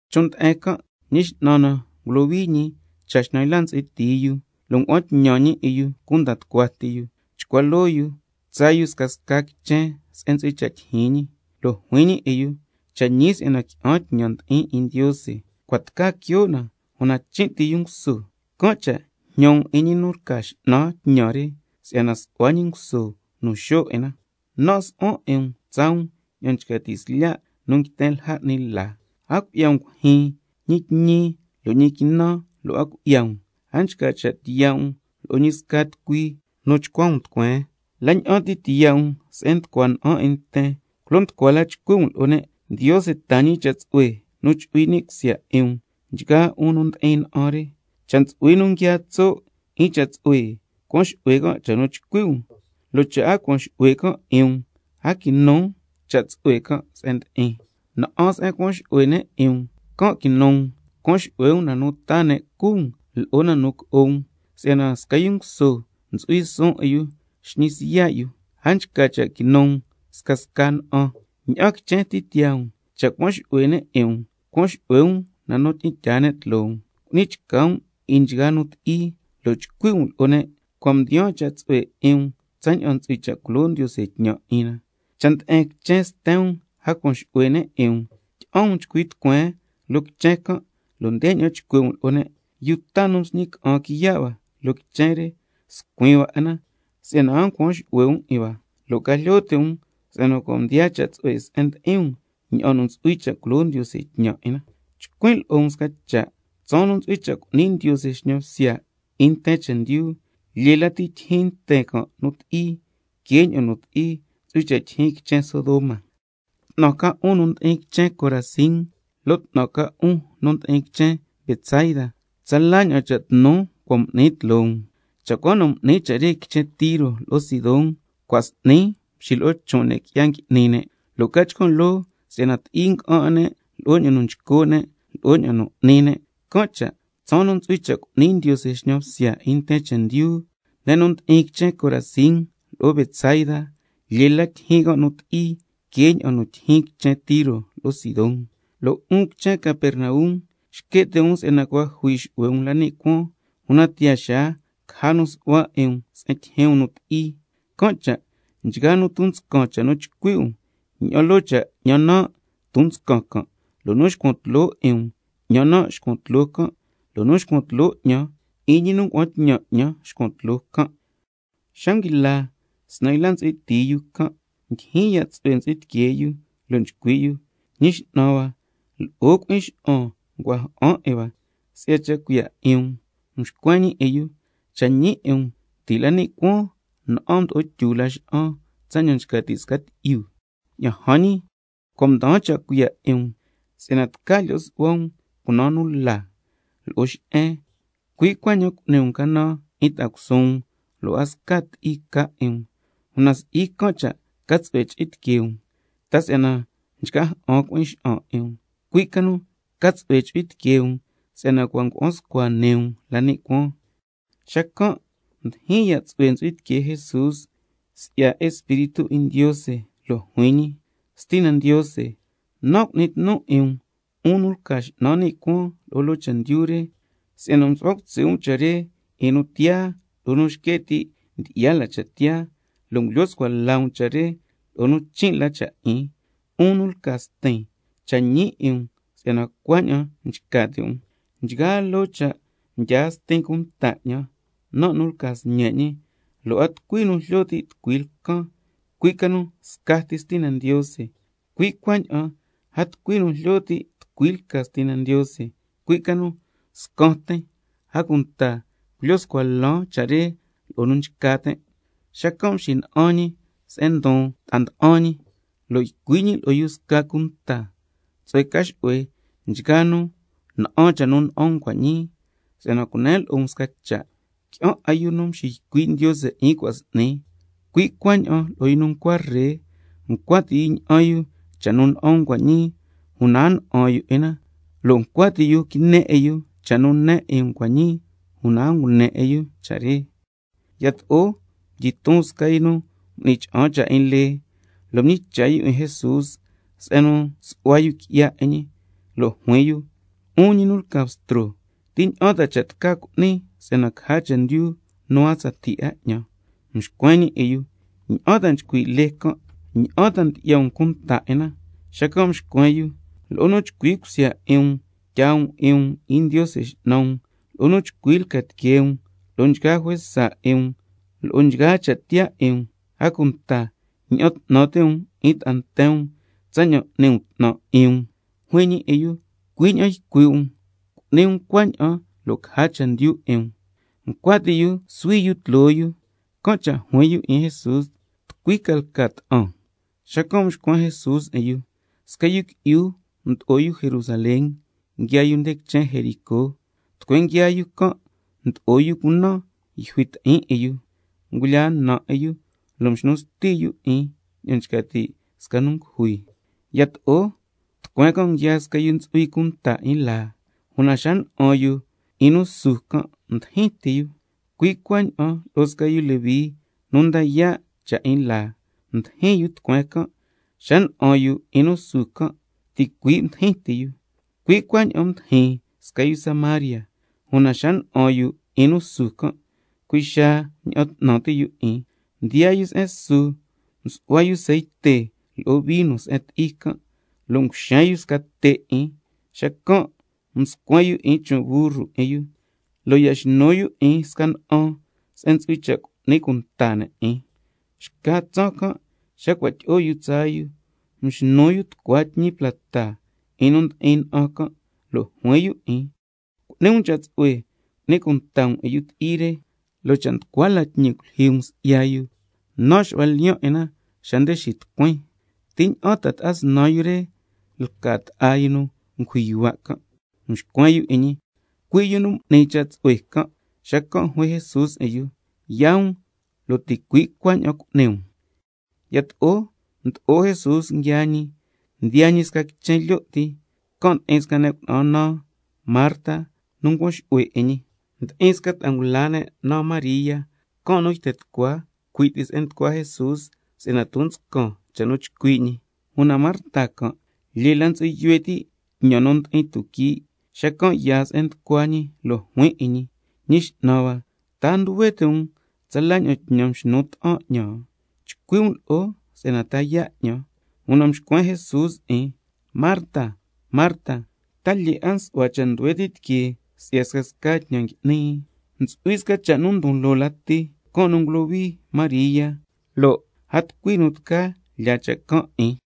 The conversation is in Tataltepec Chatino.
Chon' nde'en can', Ñi X'nan na ngulohui ñi cha xnan yla ntsu'hui tii yu, lo' ngua'an tñan ñi 'in yu cunda tucua ti yu chcua loo yu tsaa yu scasca quichen se'en ntsu'hui cha' tyijyin ñi. Lo' juin ñi 'in yu: Cha' ñi si'yana qui'an tñan ndi'in 'in Ndiose, cua' tca quio' na, una chin' ti yu nguso, can' cha' jñan um cha' tsu'hue 'in ñi nu lca X'nan tñan re si'yana su'hua ñi nguso nu xo' 'in na. Nan' su'huan 'in um tsaa um ña'an nchca ti' slya' nu nguiten lja ni' la. A cui'ya um cuijyin, ñi tñi lo' ñi quinan lo' a cui'ya um, a nchca cha' tiya' um lo'o ñi sca tucui nu chcua um tucueen. La ña'an ti tiyaa um se'en nducua na'an 'in nten, ndeña'an chcui' um lo'o ne' culo nducua la: Ndiose taa ñi cha' tsu'hue nu chu'hui ni' cusya 'in um nchgaa 'un nu ndi'in na'an re. Cha' ntsu'hui nu nguiaa tso' 'in cha' tsu'hue, cuan xu'hue can' cha' nu chcui' um, lo' cha' a cuan xu'hue can' 'in um, a quinu cha' tsu'hue se'en ndi'in can'. Na'an se'en cuan xu'hue ne' 'in um, can' quinu um, cuan xu'hue um na nu taa ne' cu um lo'o na nu co'o um, si'yana sca yu nguso ntsu'hui suun 'in yu xñi yu siya' yu. A nchca cha' quinu um scasca na'an. Ña'an quichen ti tiyaa um, cha' cuan xu'hue ne' 'in um, ca xu'hue um na nu tyi'in tyaa ne' tloo um, cu'ni chca um 'in nchgaa nu ti'i, lo' chcui' um lo'o ne': Cua' mdiyaan cha' tsu'hue 'in um tsaña'an ntsu'hui cha' culo Ndiose tñan 'in na. Cha' nde'en quichen sten um a cuan xu'hue ne' 'in um, tyi'an um chcui tucueen loo quichen can', lo' ndeña'an chcui' um lo'o ne': Yuu ta nu msñi ca'an quiya' hua loo quichen re scuin hua 'in na si'yana a ncuan xu'hue um 'in hua, lo' ca jlyo ti' um si'yana cua' mdiyaan cha' tsu'hue se'en ndi'in um ña'an ntsu'hui cha' culo Ndiose tñan 'in na. Chcuin' lo'o um sca cha', tsaan nu ntsu'hui cha' cu'ni Ndiose xñan bsya 'in nten chendyu, lyee lati tyijyin nten can' nu ti'i que ña'an nu ti'i ntsu'hui cha' tyijyin quichen Sodoma. 'Tnan ca um, 'un nu ndi'in quichen Corazín, lo' 'tnan ca um, 'un nu ndi'in quichen Betsaida, tsala ña'an cha' tnu cua' m'nin tloo um. Cha' cua na m'nin cha' re quichen Tiro lo'o Sidón, cua' s'ni mxilo'o chon' ne' qui'ya ngui'ni ne', lo' ca chcan' loo si'yana ti'i nga'an 'in ne' lo'o ña'an nu nchco' ne' lo'o ña'an nu n'ni ne'. Can' cha' tsaan nu ntsu'hui cha' cu'ni Ndiose xñan bsya 'in nten chendyu, ne' nu ndi'in quichen Corazín lo'o Betsaida, lyee lati tyijyin can' nu ti'i que ña'an ti'i nu ntsu'hui cha' tyijyin quichen Tiro lo'o Sidón. Lo' 'un quichen Capernaum, —xque' ti' um si'yana cua' jui xu'hue um la ni' cuaan, una tiyaa xaa caja nu su'hua 'in um se'en tyijyin um nu ti'i—. Can' cha' nchgaa nu ton nscan cha' nu chcui' um, ña'an loo cha' 'ñan nan' ton nscan can', lo' nu xcuan tloo 'in um, 'ñan nan' xcuan tloo can', lo' nu xcuan tloo 'ñan, 'in ñi nu ngua'an tñan 'ñan xcuan tloo can'. Xa nguila snan yla ntsu'hui tii yu can', ndyijyin ya' tsu'hue ntsu'hui tiquee yu lo' nchcui' yu: Ñi X'nan hua, lo'o cui'in xa'an ncua ja'an 'in hua si'ya cha' cuiya' 'in um. Mxcuen ñi 'in yu: Cha' ñi 'in um, ti' la ni' cuaan na'an mdyi'o tyu Laxa'an tsaña'an nchca ti' quii' 'in tyi'yu. Ña'an jan ñi, cua' mdaan cha' cuiya' 'in um si'yana tca lyo' su'hua um 'in cunaan la lo'o xe'en, tlyu la cha' cuiya' re que 'in ta'a cusuun um, lo' a sca ti'i ca 'in um. Una si'i can' cha' ca tsu'hue chu'hui tiquee um, ta si'yana nchca ja'an cui'in xa'an 'in um, cui' ca nu ca tsu'hue chu'hui tiquee um si'yana cua' ngua'an scua nii um la ni' cuaan. Xacan' ndyijyin ya' tsu'hue ntsu'hui tiquee Jesús si'ya Espíritu 'in Ndiose, lo' juin ñi: Stina Ndiose, nan' cu'nin tnun 'in um, 'un nu lca X'nan ni' cuaan lo'o loo chendyu re, si'yana msu'hua cutsi' um cha' re 'in nu tiyaa lo'o nu nxque' ti' ndyi'ya la cha' tiyaa, lo' ngulyo scua la um cha' re lo'o nu chin' la cha' 'in. 'Un nu lca Stin, cha' ñi 'in um si'yana cuaña'an nchca ti' um. Nchgaa loo cha' mdyaa Stin cunta 'ñan, nan' nu lca Sñe' ñi, lo' a tucui nu jlyo ti' tucui lcan, cui' ca nu scati Stina Ndiose, cui' cuaña'an a tucui nu jlyo ti' tucui lca Stina Ndiose, cui' ca nu scan tin, a cunta culyo scua lan cha' re lo'o nu nchca tin'. Xacan' mxina'an ñi se'en ndon ta'a nda'an ca ñi, lo' ycui' ñi lo'o yu sca cunta: Tsu'hue ca xu'hue nchgaa nu na'an cha' nu na'an um cua' ñii, si'yana cunen lo'o um sca cha', qui'an 'a yu nu mxiycui' Ndiose 'in cua' s'ni cui' cuaña'an lo'o nu ncua ree, ncua ti' yu ña'an yu cha' nu na'an um cua' ñii, una a na'an yu 'in na, lo' ncua ti' yu quine 'in yu cha' nu ne 'in um cua' ñii, una a ngune 'in yu cha' re. Yato'o mdyiton sca yu nu m'ni cha'an cha' 'in lee, lo' mñicha' yu 'in Jesús se'en nu su'hua yu qui'ya 'in ñi, lo' juin yu: 'Un ñi nu lca Bstro, ¿ti ña'an cha' nu tca cu'nin si'yana caja chendyu nu a tsatii 'a 'ñan? Mxcuen ñi 'in yu: ¿Ña'an ta nchcui' lee can'? ¿Ña'an ta ndyi'ya um cunta 'in na? Xacan' mxcuen yu: —Lo'o nu chcui cusya 'in um tyaa um 'in um 'in Ndiose X'nan um, lo'o nu chcui lca tiquee um, lo'o nchgaa juesa 'in um—, lo'o nchgaa cha' tiyaa 'in um, a cunta —ña'an 'tnan ti' um 'in ta'a nten um tsaña'an n'ni um 'tnan 'in um—. Juin ñi 'in yu: Cui' ña'an ycui' um, cu'ni um cuaña'an lo' caja chendyu 'in um. Ncua ti' yu suhui yu tloo yu, can' cha' juin yu 'in Jesús: ¿Tucui ca lca ta'an? Xacan' mxcuen Jesús 'in yu: Sca yu qui'yu mdo'o yu Jerusalén nguiaa yu nde quichen Jericó, tucueen nguiaa yu can' mdo'o yu cunan nu yjui ti'in 'in yu, ngulyaa na 'in yu, lo' mxnu sti yu 'in ña'an nchca ti' sca yu ngujui. Yato'o tucueen can' nguiaa sca yu nu ntsu'hui cunta 'in laa, una xa na'an yu 'in nu su can' mdijin ti yu. Cui' cuaña'an lo'o sca yu Leví nu nda yaa' cha' 'in laa, mdijin tucueen can', xa na'an yu 'in nu su can' ticui' mdijin ti yu. Cui' cuaña'an mdijin sca yu Samaria, una xa na'an yu 'in nu su can' cui' xaa mña'an 'tnan ti' yu 'in. Mdiyaa yu se'en su, msu'hua yu ceite lo'o vino se'en ti'i can', lo' nguxen yu te' 'in na, xacan' mscuen yu 'in chon' burru 'in yu, lo' ya xnu yu 'in sca na'an se'en ntsu'hui cha' cu'ni cunta ne' 'in. Xca tsaan can' xa cua' tyi'o yu tsaa yu, mxnu yu tucua tñi plata 'in nu ndi'in na'an can', lo' juin yu 'in: Cu'ni um cha' tsu'hue cu'ni cunta um 'in yu ti'i re, lo' cha' nducua la tñi culyijyi um si'ya yu, nan' xu'huan lyiyan' 'in na xa nde xitucuin. ¿Ti ña'an ta ta'a snan yu re lca ta'a yu nu m'ni lyi'o yu cunan 'in can'? Mxcuen yu 'in ñi: Cui' yu nu m'ni cha' tsu'hue lo'o can'. Xacan' juin Jesús 'in yu: Yaa um, lo' ticui' cuaña'an cu'ni um. Yato'o mdo'o Jesús nguiaa ñi, mdiyaa ñi sca quichen lyo' ti, can' ndi'in sca ne' cuna'an naan Marta nu ncuan xu'hue 'in ñi. Ndi'in sca ta'a ngula ne' naan María, can' nu yten tucua cui' ti se'en nducua Jesús si'yana ton nscan cha' nu nchcui' ñi. Una Marta can' lyee la ntsu'hui yuhue ti' tñan nu ndi'in tuquii', xacan' yaa se'en nducua ñi lo' juin 'in ñi: Ñi X'nan hua, ¿ta a nduhue ti' um tsala ña'an tñan mxnu ta'an 'ñan? Chcui' um lo'o si'yana ta yaa' 'ñan. Una mxcuen Jesús 'in: Marta, Marta, ta lyee 'a nsu'hua yuhue ti' tiquee si'ya scasca tñan ngui'ni. Ntsu'hui sca cha' nu ndon loo lati, can' nu ngulohui María, lo' a tucui nu tca lyaa cha' can' 'in.